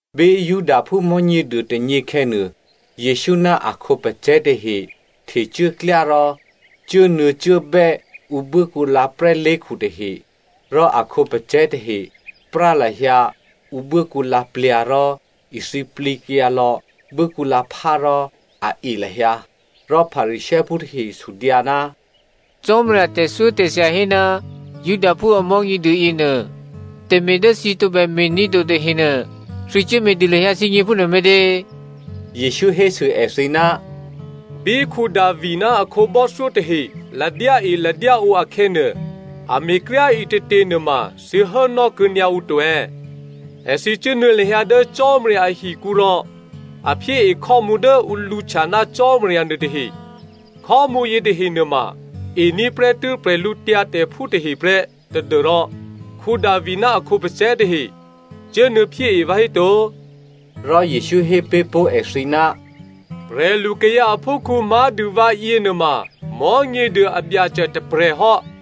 Bí Judaphú Mò̤́nyěduô tônyě khè̌nuô, Jesǔ ná a khǒpacè̤̌ tahe htecuốklyá rò cuốnuô̌cuốbè́ ǔ buốkǔlǎ prè́lé̤khu tahe. Rò a khǒpacè̤̌ tahe prá lahyǎ ǔ buốkǔlǎ plyǎ̤ rò ithǐplǐkyǎ lò̌ buốkǔlǎphá rò a e lahyǎ. Rò Pharisěophú tahe sudyǎ, “Cò́marya tè̤thyótè̤thya hé ná Judaphú a Mò̤́nyěduô yěnuô, tè̤me̤ dố thǐ tǒbè me̤ní̤ to tahenuô, thǐ cuốme̤dû lahyǎ thǐgně phúnuô me̤tě?” Jesǔ hésû èthǐ, “Bí Davi ná a khǒbò́thyó tahe ladyáeladyáǒ akhè̌nuô, a me̤kryá꤮ ǐtětě nuôma thǐ hốnò́ kuô̌nyǎ ǔ to è̌? Èthǐ cuốnuô̌ lahyǎ dố Cò́marya ahikǔ rò a phyée khò́mǔ dố ǔ lǔhtya ná Cò́marya nuôtahe, khò́mǔ yětahe nuôma ení̤ prè́tû́ prè̤lǔtyǎtè̤phú tahe prè́ tadû́rò Davi ná a khǒpacè̤̌ tahe cuốnuô̌phyée vǎhéto?” Rò Jesǔ hé pé̤ pó̤ èthǐ, “Prè̤lukayǎ aphúkhǔ má̤dû vǎ yěnuôma Mò̤́nyěduô a Byacè tôprè̤hò́.”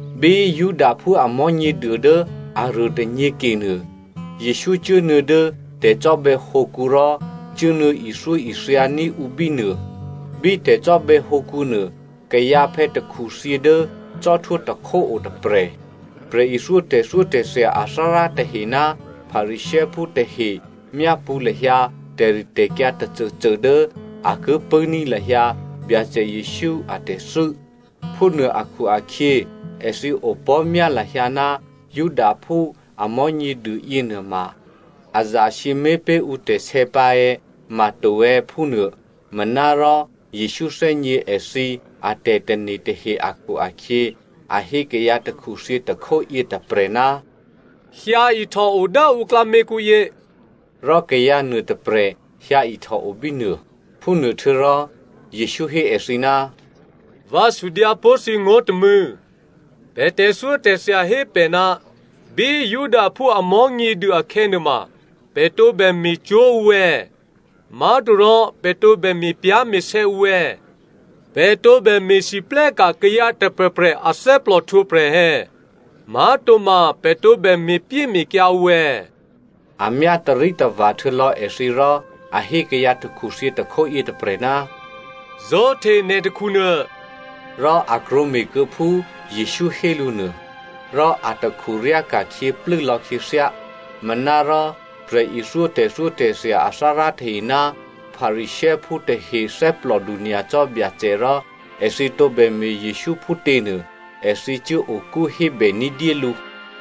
Bí Judaphú a Mò̤́nyěduô dố aruô tônyě kenuô, Jesǔ cuốnuô̌ dố tè̤cò́bè̌hǒkǔ rò cuốnuô̌ ithyóithyaní̤ ǔ bínuô. Bí tè̤cò́bè̌ hǒkǔnuô kayǎphè̌ takhuthyě dố cò́htwó tôkhó o tôprè̤. Prè̤ithyó tè̤thyótè̤thya athárá tahe ná Pharisěophú tahe myápṳ̌ lahyǎ tè̤ritè̤kyǎ tôcôcô dố a ki pṳ̂́ní̤ lahyǎ Byacè Jesǔ a tè̤thû́. Phúnuô akhu-akhyě èthǐ opò̤́myá lahyǎ ná Judaphú a Mò̤́nyěduô yěnuôma a zasǐmé̤ pé̤ ǔtè̤sè̌ pǎ è̌, ma to è̌, phúnuô. Manárò Jesǔ thè́gně èthǐ atè̤tane̤ tahe akhu-akhyě a hé kayǎ takhuthyě tôkhó yětôprè̤, “Hyǎihtòo dố ǔ klǎměkǔyě,” rò kayǎ nuôtôprè̤ hyǎihtòo bínuô. Phúnuôhtuô̌rò Jesǔ hé èthǐ, “Vǎ sudyǎ pó̤ thǐ ngó̤ tômû̌, pè̤ tè̤thyótè̤thya hé pè̤ ná bí Judaphú a Mò̤́nyěduô akhè̌nuôma, pè̤ tǒbè me̤ cwó̤ ǔ è̌? Má̤torò pè̤ tǒbè me̤pyá̤me̤sè̌ ǔ è̌? Pè̤ tǒbè me̤lwóhteka̤ kayǎ tôprè̤prè̤ athè́plò htwǒprè̤ è̌? Má̤toma pè̤ tǒbè me̤pyéme̤kyǎ ǔ è̌?” A myá tarítava̤ htuô̌lò̌ èthǐ rò a hé kayǎ takhuthyě tôkhó yětôprè̤, “Zó̤hte nè̤ takhunuô,” rò a krwǒme̤ kuô̌phú Jesǔ hé lǔ nuô, rò atakhu ryáka̤khyě plû́lò̌ khyěthyá. Manárò prè̤ithyó tè̤thyótè̤thya athárá tahe ná Pharisěophú tahe thè́plòdu nyacò́ Byacè rò èthǐ tǒbè me̤ Jesǔ phútěnuô, èthǐ cuố okú hébè ní̤dyé lǔ.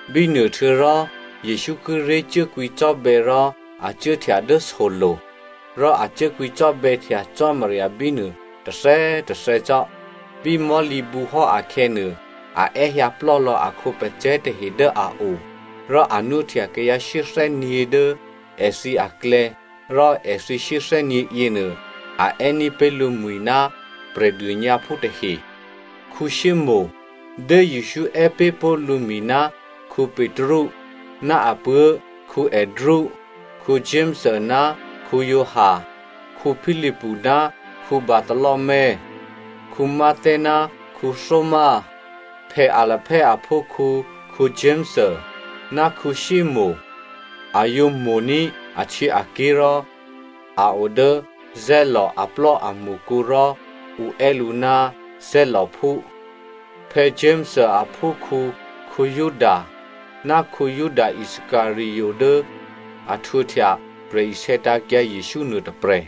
Bínuôhtuô̌rò, Jesǔ kíré̤ cuố kwǐcò́bè̌ rò a cuốhtya dố solo̤. Rò a cuố kwǐcò́bè̌htya Cò́marya bínuô tôthè̌꤮ tôthè̌ cò́. Bí mò̤́lǐbǔ hò́ akhè̌nuô, a è́hyǎplò́ lò̌ a khǒpacè̤̌ tahe dố a o, rò a nwóhtya kayǎ shyéthè́nyě̤ dố èthǐ aklè̌, rò èthǐ shyéthè́nyě̤ yěnuô, a è́ní̤ pé̤ lǔmwi̤ ná prè̤dônyǎphú tahe. Simonè (Dố Jesǔ è́ pé̤ pó̤ lǔmwi̤ ná Petru) ná apuố̤ Andrea, Jakomo ná Giovanni, Philipu ná Bartholomeo, Matteo ná Thomazo, Alphaeo aphúkhǔ Jakomo, ná Simonè (A yǒ mo̤ní̤ ahtyěaké̤ rò a o dố Zeloto aplò́amṳkǔ rò ǔ è́ lǔ ná Zelotophú.) Jakomo aphúkhǔ Juda, ná Juda Iscariot dố a htwǒhtya prè̤isè̌tǎ̤kyǎ Jesǔ nuôtôprè̤.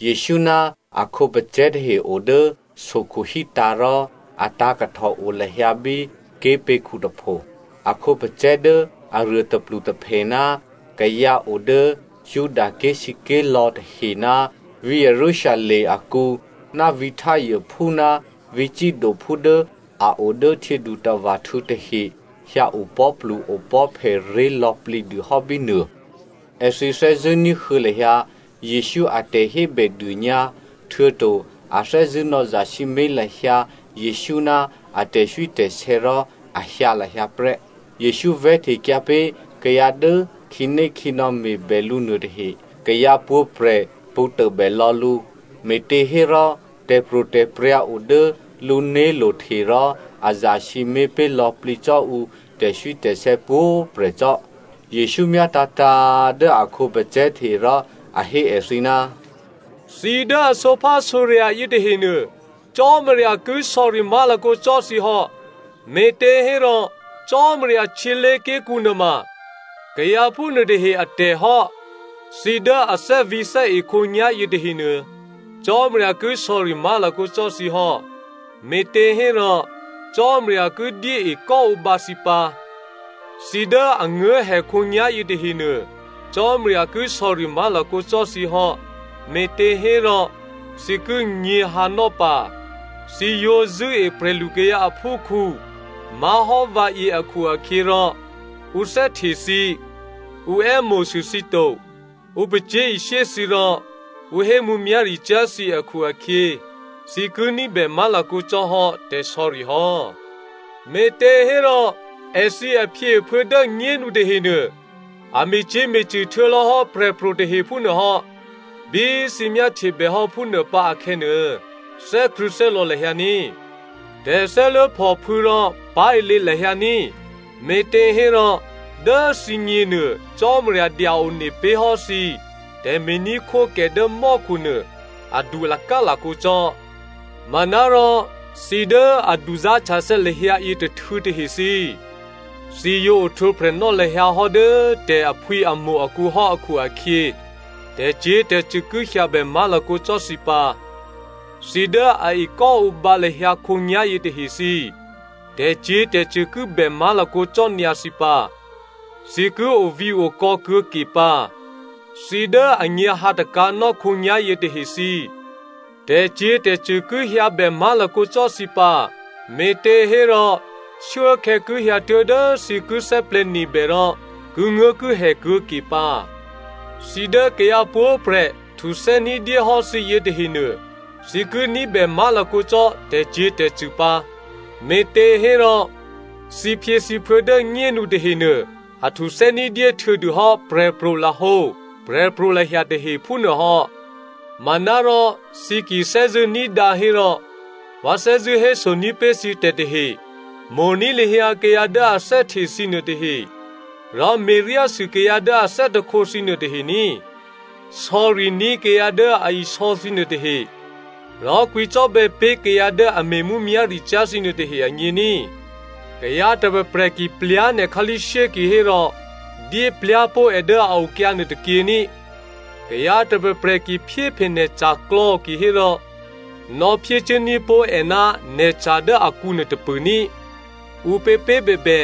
Jesǔ ná a khǒpacè̤̌ tahe o dố sokhu hítǎ̤ rò a tǎ̤kahtò o lahyǎ bí ké̤pě̤khu tôpho. A khǒpacè̤̌ dố aruô tôplutôphè ná kayǎ o dố Judaké̤ sǐké̤lò̌ tahe ná dố vǐ̤ Jerusalem akǔ ná vǐ̤ Tyrephú ná vǐ̤ Sidophú dố a o dố htyědutava̤htû̌ tahe hyǎ opò̤́plu-opò̤́phè ré̤ lò̌plǐ dû hò́ bínuô. Èthǐ thè́zṳ̂́ ní̤huô̌ lahyǎ Jesǔ a tè̤hébèdônyǎ htuô̌to a thè́zṳ̂́ nò̌zasǐmé̤ lahyǎ Jesǔ ná a tè̤swítè̤sè̌ rò a hyǎ lahyǎ prè́. Jesǔ vè̤́htekyǎ pé̤ kayǎ dố khǐnékhǐnò̌ me̤bè lǔ nuôtahe. Kayǎ pwǒ̤prè̤ pṳ̌ tôbè lò̌ lǔ, me̤těhérò tè̤pro̤tè̤prya̤ o dố lǔné̤lo̤ hte rò a zasǐmé̤ pé̤ lò̌plǐ cò́ ǔ tè̤swítè̤sè̌ pwǒ̤꤮ prè̤ cò́. Jesǔ myátǎ̤tǎ̤꤮ dố a khǒpacè̤̌ tahe rò a hé èthǐ, “Thǐ dố a sǒphásǒrya̤ yětahenuô, Cò́marya ki sò̌ri má̤lakǒ cò́ thǐ hò́, me̤těhérò Cò́marya htyělé̤ké̤kǔ nuôma kayǎ phúnuôtahe atè̤ hò́. Thǐ dố a thè́vǐ̤thè́e khǒnyá̤ yětahenuô, Cò́marya ki sò̌ri má̤lakǒ cò́ thǐ hò́, me̤těhérò Cò́marya ki dyé ekò́ǒbǎ thǐ pǎ! Thǐ dố a nguố̤hè khǒnyá̤ yětahenuô, Cò́marya ki sò̌ri má̤lakǒ cò́ thǐ hò́, me̤těhérò thǐ ki nyě̤hǎnò́ pǎ! Thǐ yǒ zṳ̂́e prè̤lukayǎ aphúkhǔ má̤hò́ vǎyě akhu-akhyě rò ǔ thè́hte thǐ, ǔ è́mo̤sû thǐ to, ǔ pacyé̤ishyé thǐ rò ǔ hé mǔmyá̤ricyá̤ thǐ akhu-akhyě, thǐ ki ní̤bè má̤lakǒ cò́hò́ tè̤sò̌ri hò́. “Me̤těhérò èthǐ aphyěaphuô̌ dố꤮ nyénu tahenuô, a me̤cyě̤me̤cṳ̂ htuô̌lò̌hò́ prè̤pro̤ tahe phúnuô hò́. Bí thǐ myáhtye bèhò́ phúnuô pǎ akhè̌nuô, thè́krṳ̂̌thè́lò̌ lahyǎ ní꤮. Thè́lò̌thè́lya̤ rò pá̤ilě lahyǎ ní꤮, me̤těhérò dố thǐgněnuô, Cò́marya dya-one pé̤hò́ thǐ tè̤me̤ní̤khwókè dố mò́khu nuô adu lakálakǒ cò́. Manárò thǐ dố a duzá̤htyathè̌ lahyǎ yětôhtû̌ tahe thǐ, thǐ yǒ ohtwǒprè̤nò́ lahyǎ hò́ dố tè̤ aphwǐamo̤ akǔ hò́ akhu-akhyě, tè̤cyě̤tè̤cṳ̂ ki hyǎbè má̤lakǒ cò́ thǐ pǎ. Thǐ dố a ekò́ǒbǎ lahyǎ khǒnyá̤yě tahe thǐ꤮, tè̤cyě̤tè̤cṳ̂ ki bè má̤lakǒ cò́ nyǎ thǐ pǎ, thǐ ki ovǐ̤okò̌ kuô̌ke pǎ! Thǐ dố a nyě̤hǎtakǎ̤nò́ khǒnyá̤yě tahe thǐ, tè̤cyě̤tè̤cṳ̂ ki hyǎbè má̤lakǒ cò́ thǐ pǎ, me̤těhérò shuốkhè̌ ki hyǎtuố̤ dố thǐ ki thè́plè̤̌nebè rò kinguố̤kihè kuô̌ke pǎ! “Thǐ dố kayǎ pwǒ̤prè̤ htuthè́ ní̤dyé hò́ thǐ yětahenuô, thǐ ki ní̤bè má̤lakǒ cò́ tè̤cyě̤tè̤cṳ̂ pǎ, me̤těhérò thǐphyěthǐphuô̌ dố꤮ nyénu tahenuô a htuthè́ ní̤dyé htuô̌dûhò́ prè̤pro̤lahǒ prè̤pro̤lahya tahe phúnuô hò́. “Manárò thǐ ki thè́zṳ̂́ ní̤dǎ hérò vǎ thè́zṳ̂́ hésoní̤ pé̤ thǐ tè̤tahe, mo̤ní̤ lahyǎ kayǎ dố a thè́hte thǐ nuôtahe rò me̤ryásû kayǎ dố a thè́hte thǐ nuôtahe ní꤮. Sò̌riní̤ kayǎ dố a isò̌ thǐ nuôtahe, rò kwǐcò́bè̌ pé̤ kayǎ dố a me̤ mǔmyá̤ricyá̤ thǐ nuôtahe agně ní꤮. Kayǎ tôprè̤prè̤ ki plyá̤ nè̤ khǎlí̤shyé kihérò dyé plyá̤ pó̤ è dố a okyǎ nuôtôkyě ní꤮. Kayǎ tôprè̤prè̤ ki phyéphe nè̤ ca̤klò̌ kihérò, nò̌phyécuốní̤ pó̤ è ná nè̤ca̤ dố akǔ nuôtôpṳ̂ ní꤮. Ǔpěpě꤮ bèbè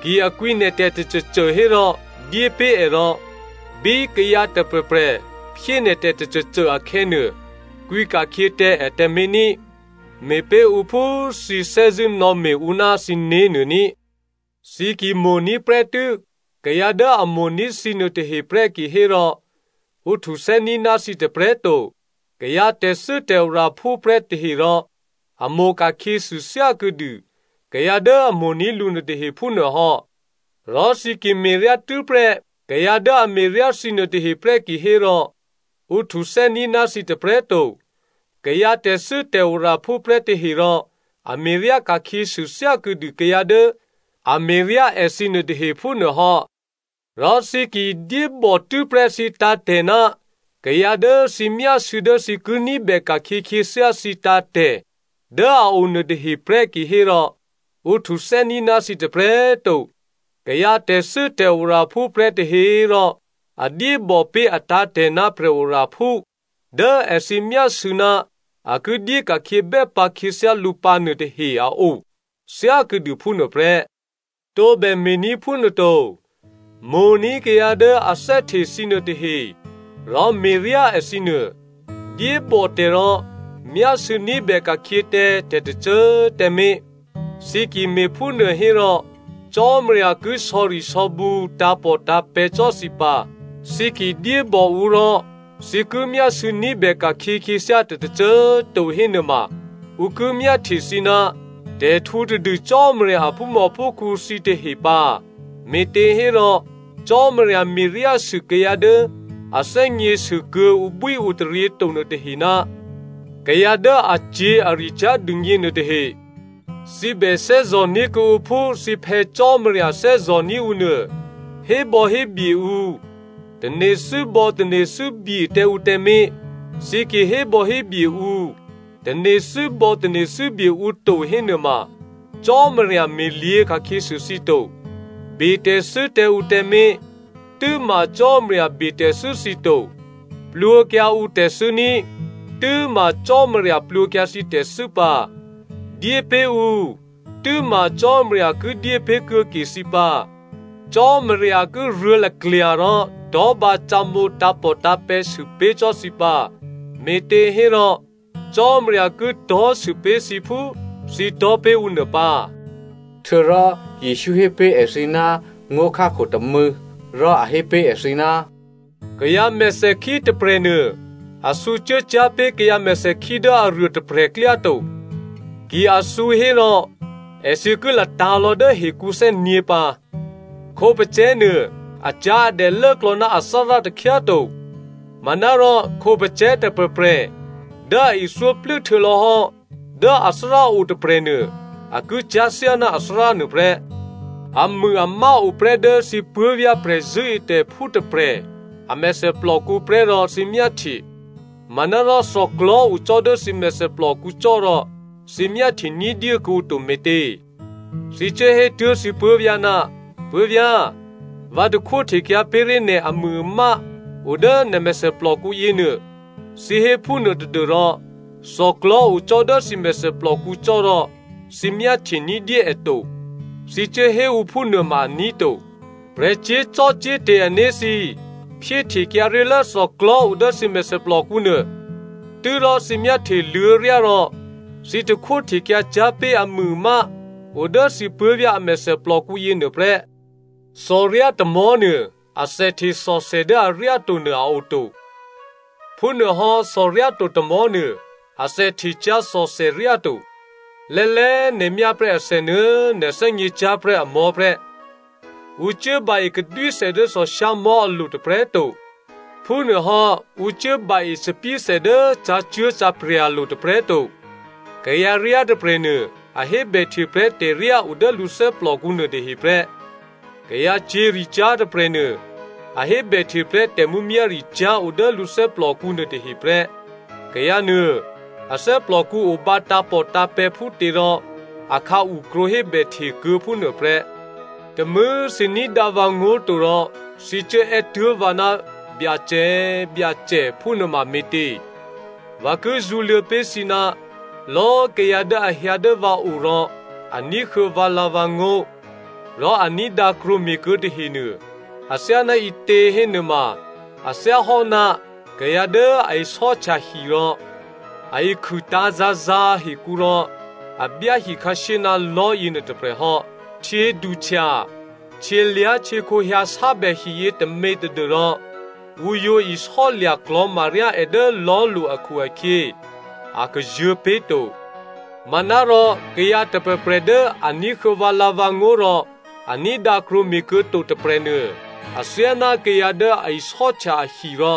ki a kwǐ nè̤tè̤ tôcôcô hérò dyépé̤ è rò bí kayǎ tôprè̤prè̤ phyé nè̤tè̤ tôcôcô akhè̌nuô, kwǐ ka̤khyě tǎ è tǎmé̤ ní꤮. Me̤pé̤ ǔ phú thǐ thè́zṳ̂́ nò̌me̤ ǔ ná thǐné̤ nuô ní꤮. “Thǐ ki mo̤ní̤ prè́tû́ kayǎ dố a mo̤ní̤ thǐ nuôtahe prè́ kihérò ǔ htuthè́ní̤ ná thǐ tôprè̤꤮ to. Kayǎ tè̤thû́tè̤oraphú prè́ tahe rò a mo̤ ka̤khyěsû thyákuô̌dû kayǎ dố a mo̤ní̤ lǔ nuôtahe phúnuô hò́. Rò thǐ ki me̤ryá tû́prè́ kayǎ dố a me̤ryá thǐ nuôtahe prè́ kihérò ǔ htuthè́ní̤ ná thǐ tôprè̤꤮ to. Kayǎ tè̤thû́tè̤oraphú prè́ tahe rò a me̤ryá ka̤khyěsû thyákuô̌ dû kayǎ dố a me̤ryá èthǐ nuôtahe phúnuô hò́. Rò thǐ ki dyébò tû́prè́ thǐ tǎ̤tè̤ ná kayǎ dố thǐ myásû̌ dố thǐ ki ní̤bè ka̤khyě khyěthyá thǐ tǎ̤tè̤ dố a o nuôtahe prè́ kihérò ǔ htuthè́ní̤ ná thǐ tôprè̤꤮ to. Kayǎ tè̤thû́tè̤oraphú prè́ tahe꤮ rò a dyébò pé̤ atǎ̤tè̤ ná prè̤oraphú dố èthǐ myásû̌ ná a ki dyé ka̤khyě bè́ bǎ khyěthyá lǔ pǎnuô tahe a o, thyákuô̌dû phúnuô prè́. Tǒbè me̤ní̤ phúnuô to! Mo̤ní̤ kayǎ dố a thè́hte thǐ nuôtahe rò me̤ryá èthǐ nuô. Dyébò tè̤ rò myásû̌ ní̤bè ka̤khyě tǎ tè̤tôcô꤮ tǎmé̤. Thǐ ki me̤phúnuô hérò Cò́marya ki sò̌risò̌bǔ tǎ̤pòtǎ̤pè̤̌ cò́ thǐ pǎ, thǐ ki dyébò ǔ rò thǐ ki myásû̌ ní̤bè ka̤khyě khyěthyá tè̤ tôcô꤮ to hénuôma ǔ ki myáhtye thǐ ná tè̤htǔtadû Cò́marya aphúmòphúkhǔ thǐtahe pǎ, me̤těhérò Cò́marya me̤ryásû kayǎ dố a thè́gně sû kuô̌ ǔbwíǔtaryě to nuôtahe ná kayǎ dố acyě̤aricyá̤ dûgně nuôtahe. Thǐ bè thè́zò̤ní̤ kuô̌ǔ phú thǐ Phè̌ Cò́marya thè́zò̤ní̤ ǔ nuô. “Hébò̌hébye ǔ, tane̤thû́bò̌tane̤thû́bye tǎ ǔ tǎmé̤. Thǐ ki hébò̌hébye ǔ, tane̤thû́bò̌tane̤thû́bye ǔ to hénuôma Cò́marya me̤lyě̤ ka̤khyěsû thǐ to. Betè̤thû́ tǎ ǔ tǎmé̤, tû́ma Cò́marya betè̤thû́ thǐ to. Plwǒkyǎ ǔtè̤thû́ ní꤮, tû́ma Cò́marya plwǒkyǎ thǐ tè̤thû́ pǎ. Dyépé̤ ǔ, tû́ma Cò́marya ki dyé pé̤ kuô̌ke thǐ pǎ. Cò́marya ki ruô̤̌ laklya̤ rò tò̤́bǎ cǒmǒ tǎ̤pòtǎ̤pè̤̌ sûpé̤ cò́ thǐ pǎ, me̤těhérò, Cò́marya ki tò̤́sû pé̤ thǐ phú thǐ tò̤́ pé̤ ǔ nuô pǎ.” Htuô̌rò Jesǔ hé pé̤ èthǐ ná ngó̤khákho tômû̌, rò a hé pé̤ èthǐ, “Kayǎ mèthèkhí tôprè̤nuô a thǔcuố cyá̤ pé̤ kayǎ mèthèkhí dố aruôtôprè̤ klyá to. Ki a thǔ hérò èthǐ ki latǎ̤lò̌ dố hekǔ thè́nyě̤ pǎ. Khǒpacè̤̌nuô acyá̤adè lốklò̌ ná athárá takhyá꤮ to. Manárò, khǒpacè̤̌ tôprè̤prè̤ dố a ithyó plû́htuô̌ lò̌hò́ dố athárá o tôprè̤nuô a ki cyá̤ thyáná athárá nuôprè́. “Amûamá oprè́ dố thǐ puố̤vyá̤ prè̤zṳ̂́etè̤phú tôprè̤ a mèthèplòkǔ prè́ rò thǐ myáhtye, manárò thòklò̤́ o cò́ dố thǐ mèthèplòkǔ cò́ rò, thǐ myáhtye ní̤dyé kuô̌ǔ to me̤tě? Thǐ cuốhétuố̤ thǐ puố̤vyá̤, ‘Puố̤vyá̤꤮ vǎ takhwó htekyǎ pé̤ré̤ nè̤ amûamá o dố nè̤ mèthèplòkǔ yěnuô,’ thǐ hé phúnuô tadû́rò thòklò̤́ o cò́ dố thǐ mèthèplòkǔ cò́rò thǐ myáhtye ní̤dyé è to. Thǐ cuốhé ǔ phúnuô ma aní̤ to. Prè̤ cyé̤zò́cò́te̤ ané̤ thǐ꤮ phyéhtekyǎ ré̤lố thòklò̤́ o dố thǐ mèthèplòkǔ nuô, tû́rò thǐ myáhtyeluô̌ryá rò thǐ takhwó htekyǎ cyá̤ pé̤ amûamá o dố thǐ puố̤vyá̤ a mèthèplòkǔ yěnuô prè́. “Thòryá tômò̤́nuô athèhte thòthè dố aryáto nuô a oto. Phúnuôhò́ thòryáto tômò̤́nuô athèhte cyá̤ thòthèryá to. Lè́lè́꤮ nè̤ myáprè́ athè nuô̌꤮ nè̤ thè́gněcyá̤prè́ amò̤́ prè́. Ǔ cuốba-e kadwíthè dố thòshyámò̤́ alo̤ tôprè̤꤮ to. Phúnuôhò́ ǔ cuốba-e thòbǐthè dố cǎcuố̤cǎprya̤lo̤ tôprè̤꤮ to. Kayǎryá tôprè̤nuô a hébèhte prè́ tè̤ryá o dố lǔ thè́plòkǔ nuôtahe prè́. Kayǎcyě̤ricyá̤ tôprè̤nuô, a hébèhte prè́ tè̤mǔmyá̤ricyá̤ o dố lǔ thè́plòkǔ nuôtahe prè́. Kayǎ nuô a thè́plòkǔ obǎ tǎ̤pòtǎ̤pè̤̌ phútěrò akhǎu krwǒ hébèhte kuô̌ phúnuôprè́. “Tômû̌꤮ thǐ ní̤dǎ vǎngó̤ to rò thǐ cuố è́tuố̤ vǎ ná ‘Byacè꤮ Byacè,’ phúnuôma me̤tě? Vǎ ki zṳ̌luô̌ pé̤ thǐ ná lò̌꤮ kayǎ dố a hyǎ dố vǎ o rò a ní̤huô̌ vǎlǎ̤vǎngó̤, rò a ní̤dǎ krwǒme̤kuô̌ tahenuô athyáná ǐtě hénuôma, a thyáhò́ná kayǎ dố a isò́htya hi rò, a ikhûtǎ̤ zǎ̤zǎ̤ hekǔ rò a byá hikhǎshyé ná lò̤́ yěnuô tôprè̤ hò́. Htyěduhtya, htyělyá̤htyěkhǒ hyǎsábè hiyě tômě tadû́rò ǔ yǒ isò́lya̤ klò̤maryá è dố lò̤́lo̤ akhu-akhyě, a kazuô̤̌ pé̤to. Manárò kayǎ tôprè̤prè̤ dố a ní̤huô̌ vǎlǎ̤vǎngó̤ rò a ní̤dǎ krwǒme̤kuô̌ to tôprè̤nuô, athyáná kayǎ dố a isò́htya ahi rò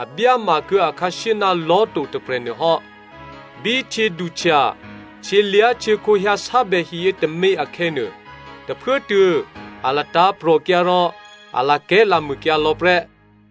a byáma kuô̌ akhǎshyé ná lò̤́ to tôprè̤ nuôhò́. Bí htyěduhtya, htyělyá̤htyěkhǒ hyǎsábè hiyě tômě akhè̌nuô, tôphuốtuô̌ a latǎ̤prò̤kyǎ rò a lakè̤́lamûkyǎ lò̌ prè́.”